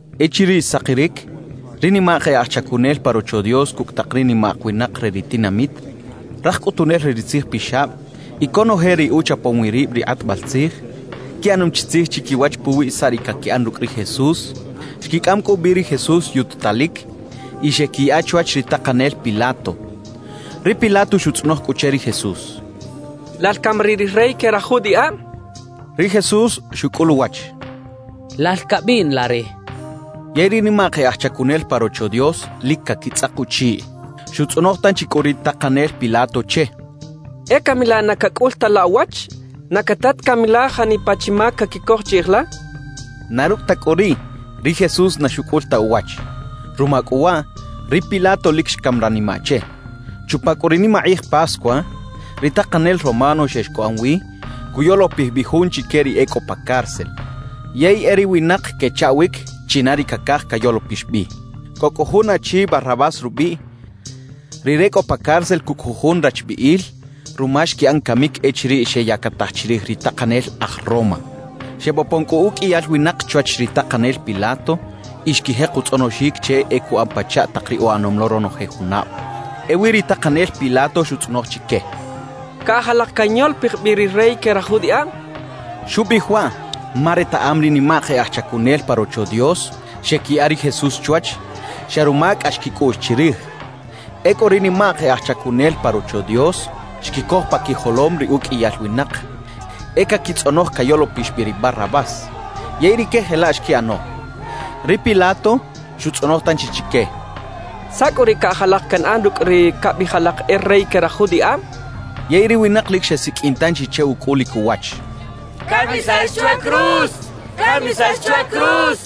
Echiriꞌ xsakiric, ri nimak e aj chacunel pa Rocho Dios cucꞌ tak ri nimak winak re ri tinamit, raj cꞌutunel re ri tzijpixab y conoje ri uchapom wi rib ri kꞌatbal tzij, quiꞌanom chi tzij chiquiwach puwi saꞌ ri caquiꞌan rucꞌ ri Jesús. Xquicꞌam cꞌu bi ri Jesús yututalic y xeꞌquiyaꞌa chwach ri takanel Pilato. Ri Pilato xutzꞌonoj cꞌu che ri Jesús: —¿Lal cami riꞌ ri rey que raj judiꞌab? —xcha che. Ri Jesús xucꞌul uwach: —Lal cabiꞌn la re —xcha che. Yey ri nimak e aj chacunel pa Rocho Dios lic caquitzꞌak uchiꞌ. Xutzꞌonoj tanchi cꞌu ri takanel Pilato che: —¿E cami laꞌ na cacꞌul ta la uwach? ¿Na cata ta cami la janipa chi mac caquicoj chiꞌij la? —xcha che. Na rucꞌ ta cꞌu riꞌ, ri Jesús na xucꞌul ta uwach. Ruma cꞌu waꞌ, ri Pilato lic xcam ranimaꞌ che. Chupa cꞌu ri nimakꞌij Pascua, ri takanel romano xex cuꞌan wi cuyolopij bi jun chique ri e cꞌo pa cárcel, yey e ri winak quechaꞌwic china ri cacaj cayolopix bi. Cꞌo cꞌu jun achi Barrabás rubiꞌ, rire cꞌo pa cárcel cucꞌ jujun rachbiꞌil ruma xquiꞌan camic echiriꞌ xeyactaj chirij ri takanel aj Roma. Xebopon cꞌu uqꞌuiyal winak chwach ri takanel Pilato y xquijek utzꞌonoxic che e cuꞌan pachaꞌ tak ri uꞌanom lo ronoje junab. Ewi ri takanel Pilato xutzꞌonoj chique: —¿Caꞌaj alak canyolopij bi ri rey que raj judiꞌab? —xchaꞌ. Xubiꞌij waꞌ ma retaꞌam ri nimak e aj chacunel pa Rocho Dios xeꞌquiyaꞌa ri Jesús chwach, xa ruma cꞌax quicꞌuꞌx chirij. Ecꞌu ri nimak e aj chacunel pa Rocho Dios xquicoj pa quijolom ri uqꞌuiyal winak e caquitzꞌonoj cayolopix bi ri Barrabás. Yey rique jelaꞌ xquiꞌano. Ri Pilato xutzꞌonoj tanchi chique: —¿Saꞌ cꞌu riꞌ caꞌaj alak canꞌan rucꞌ ri cabiꞌij alak e rey que raj judiꞌab? —xchaꞌ. Yey ri winak lic xesiqꞌuin tanchi che ucꞌulic uwach: —¡Camisax chwa cruz! —xechaꞌ.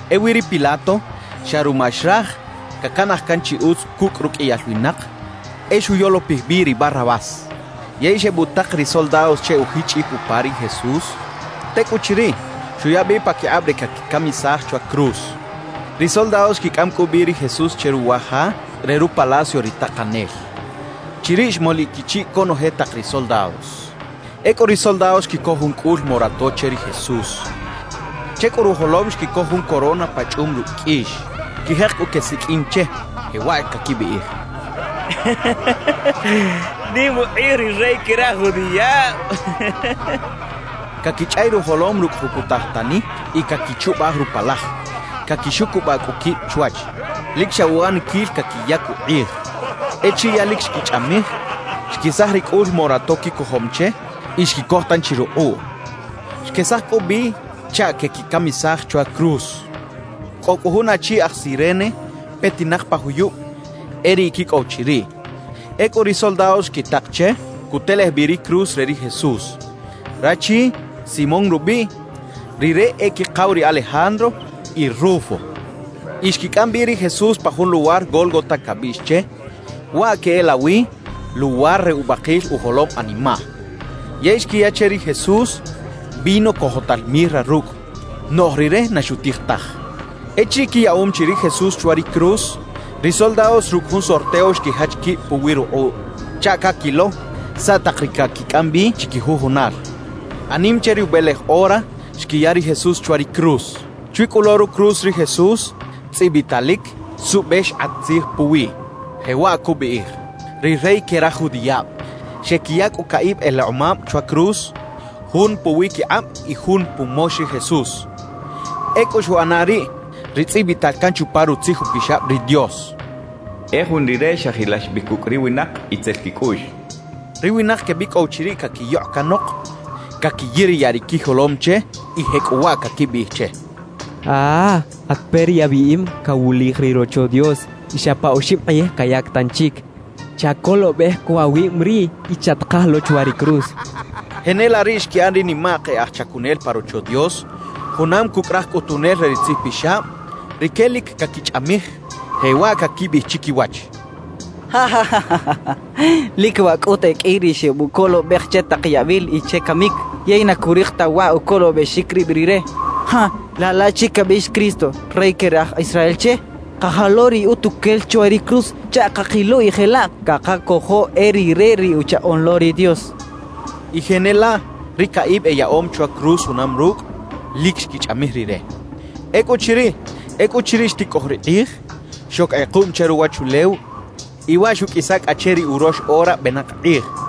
Ewi ri Pilato xa ruma xraj cacanaj can chi utz cucꞌ ruqꞌuiyal winak, e xuyolopij bi ri Barrabás. Yey xebutak ri soldados che ujichꞌic upa ri Jesús. Tecꞌuchiriꞌ, xuya bi paquikꞌab re caquicamisaj chwa cruz. Ri soldados xquicꞌam cꞌu bi ri Jesús che ruwa ja re rupalacio ri takanel. Chiriꞌ xmoliꞌ quichiꞌ conoje tak ri soldados. Ecꞌu ri soldados xquicoj jun cꞌul morato che ri Jesús. Che cꞌu rujolom xquicoj jun corona pachꞌum rucꞌ qꞌuix. Xquijek cꞌu quesiqꞌuin che, jewaꞌ caquibiꞌij: —¡Nim ukꞌij ri rey que raj judiꞌab! —quechaꞌ. Caquichꞌay rujolom rucꞌ jucutaj tani y caquichubaj rupalaj. Caquixucubaꞌ cꞌu quib chwach, lic xa uꞌaniquil caquiyac ukꞌij. Echiriꞌ ya lic xquichꞌamij, xquesaj ri cꞌul morato quicojom che y xquicoj tanchi rukꞌuꞌ. Xquesaj cꞌu bi chaꞌ queꞌquicamisaj chwa cruz. Cꞌo cꞌu jun achi aj Cirene petinak pa juyub e riꞌ quicꞌow chiriꞌ. Ecꞌu ri soldados xquitak che cutelej bi ri cruz re ri Jesús. Rachi, Simón rubiꞌ, rire e quikaw ri Alejandro y Rufo. Y xquicꞌam bi ri Jesús pa jun luwar Gólgota cabiꞌx che, waꞌ queꞌelawi “luwar re ubakil ujolom animaꞌ”. Yey xquiyaꞌ che ri Jesús vino cojotal mirra rucꞌ; noꞌj Rire na xutij taj. Echiriꞌ quiyaꞌom chi ri Jesús chwa ri cruz, ri soldados rucꞌ jun sorteo xquijach quib puwi rukꞌuꞌ chaꞌ caquilo saꞌ tak ri caquicꞌam bi chiquijujunal. Anim che ri ubelej ora, xquiya ri Jesús chwa ri cruz. Chwi cꞌu lo rucruz ri Jesús tzꞌibitalic suꞌbe xkꞌat tzij puwiꞌ, jewaꞌ cubiꞌij: «RI REY QUE RAJ JUDIꞌAB.» Xequiya cꞌu caꞌib elekꞌomab chwa cruz, jun puwiquikꞌab y jun pumox ri Jesús. Ecꞌu xuꞌana riꞌ ri tzꞌibital can chupa Rutzij Upixab ri Dios: E jun Rire xajilax bi cucꞌ ri winak itzel quicꞌuꞌx. Ri winak quebicꞌow chiriꞌ caquiyokꞌ canok, caquiyiriyaꞌ ri quijolom che y jecꞌuwaꞌ caquibiꞌij che: —¡Ah! At peꞌ ri abiꞌim cawulij ri Rocho Dios y xa pa oxib kꞌij cayac tanchic. Chacolobej cꞌu awib riꞌ y chatkaj lo chwa ri cruz —quechaꞌ. Jenelaꞌ riꞌ xquiꞌan ri nimak e aj chacunel pa Rocho Dios junam cucꞌ raj cꞌutunel re ri tzijpixab; rique lic caquichꞌamij, jewaꞌ caquibiꞌij chiquiwach: —Lic waꞌ cꞌut e qꞌui ri xebucolobej che tak yabil y che camic, yey na curik ta waꞌ ucolobexic rib rire. Laꞌ laꞌchi cabiꞌx “Cristo, Rey que Raj Israel” che, kaja lo riꞌ utuquel chwa ri cruz chaꞌ cakilo y jelaꞌ cakacojo e rire ri Uchaꞌoꞌn lo ri Dios —quechaꞌ. Y jenelaꞌ ri caꞌib eyaꞌom chwa cruz junam rucꞌ, lic xquichꞌamij Rire. Ecꞌuchiriꞌ xticꞌoj ri kꞌij, xoc kꞌekuꞌm che ruwachulew y waꞌ xuꞌqꞌuisa cꞌa che ri urox ora benak kꞌij.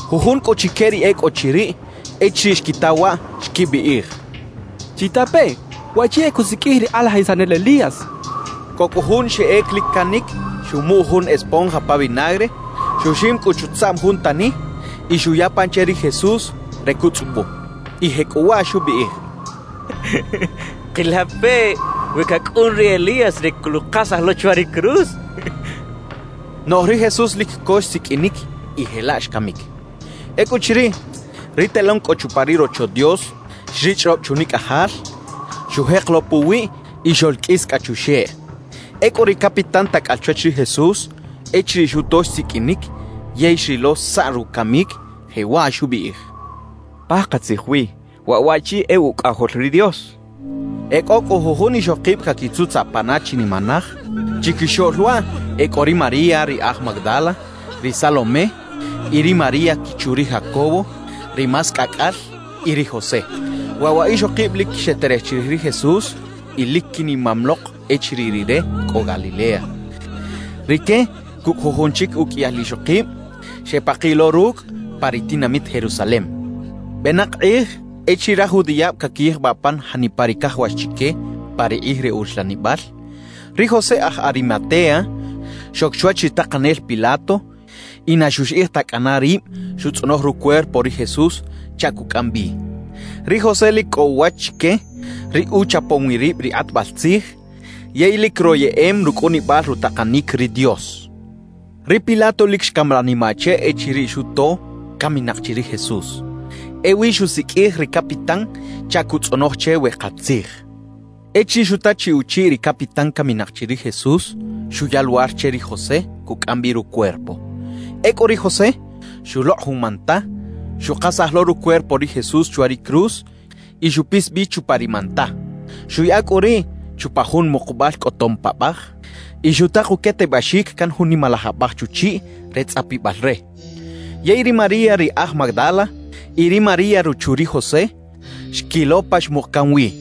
Jujun cꞌu chique ri e cꞌo chiriꞌ, echiriꞌ xquita waꞌ, xquibiꞌij: —Chitapeꞌ, waꞌchi e cusiqꞌuij ri kꞌalajisanel Elías —xechaꞌ. Cꞌo cꞌu jun xeꞌec lic canic, xumuꞌ jun esponja pa vinagre, xuxim cꞌu chutzaꞌm jun tani y xuya pan che ri Jesús re cutzꞌubu, y jecꞌuwaꞌ xubiꞌij: —Kila peꞌ we cacꞌun ri Elías re coluꞌkasaj lo chwa ri cruz —xchaꞌ. Noꞌj ri Jesús lic co xsiqꞌuinic y jelaꞌ xcamic. Ecꞌuchiriꞌ, ri telón cꞌo chupa ri Rocho Dios xrichꞌrob chunicꞌajal; xujek lo puwiꞌ y xoꞌlqꞌuis cꞌa chuxeꞌ. Ecꞌu ri capitán tacꞌal chwach ri Jesús, echiriꞌ xuto xsiqꞌuinic yey xrilo saꞌ rucamic, jewaꞌ xubiꞌij: —¡Pakatzij wi, waꞌ waꞌchi e Ucꞌajol ri Dios! —xchaꞌ. E cꞌo cꞌu jujun ixokib caquitzutzaꞌ pana chinimanaj. Chiquixoꞌl waꞌ e cꞌo ri María ri aj Magdala, ri Salomé y ri María quichu ri Jacobo (ri más cꞌacꞌal) y ri José. Waꞌ wa ixokib lic xeterej chirij ri Jesús y lic quinimam lok echiriꞌ Rire cꞌo Galilea. Rique cucꞌ jujun chic uqꞌuiyal ixokib, xepakiꞌ lo rucꞌ pa ri tinamit Jerusalem. Benak kꞌij, echiriꞌ raj judiꞌab caquiyijbaꞌ pan janipa ri cajawax chique pa ri kꞌij re uxlanibal, ri José aj Arimatea xoc chwach ri takanel Pilato y na xuxiꞌij ta cꞌana rib xutzꞌonoj rucuerpo ri Jesús chaꞌ cucꞌam bi. (Ri José lic cꞌo uwach chique ri uchapom wi rib ri kꞌatbal tzij yey lic royeꞌem rucꞌunibal rutakanic ri Dios.) Ri Pilato lic xcam ranimaꞌ che echiriꞌ xuto caminak chi ri Jesús. Ewi xusiqꞌuij ri capitán chaꞌ cutzꞌonoj che we katzij. Echiriꞌ xuta chi uchiꞌ ri capitán caminak chi ri Jesús, xuya luwar che ri José cucꞌam bi rucuerpo. Ecꞌu ri José xulokꞌ jun manta, xukasaj lo rucuerpo ri Jesús chwa ri cruz y xupis bi chupa ri manta. Xuꞌyaꞌa cꞌu riꞌ chupa jun mukubal cꞌotom paꞌbaj y xutak uquetebaxic can jun nimalaj abaj chuchiꞌ re tzꞌapibal re. Yey ri María ri aj Magdala y ri María ruchu ri José, xquilo pa xmuk can wi.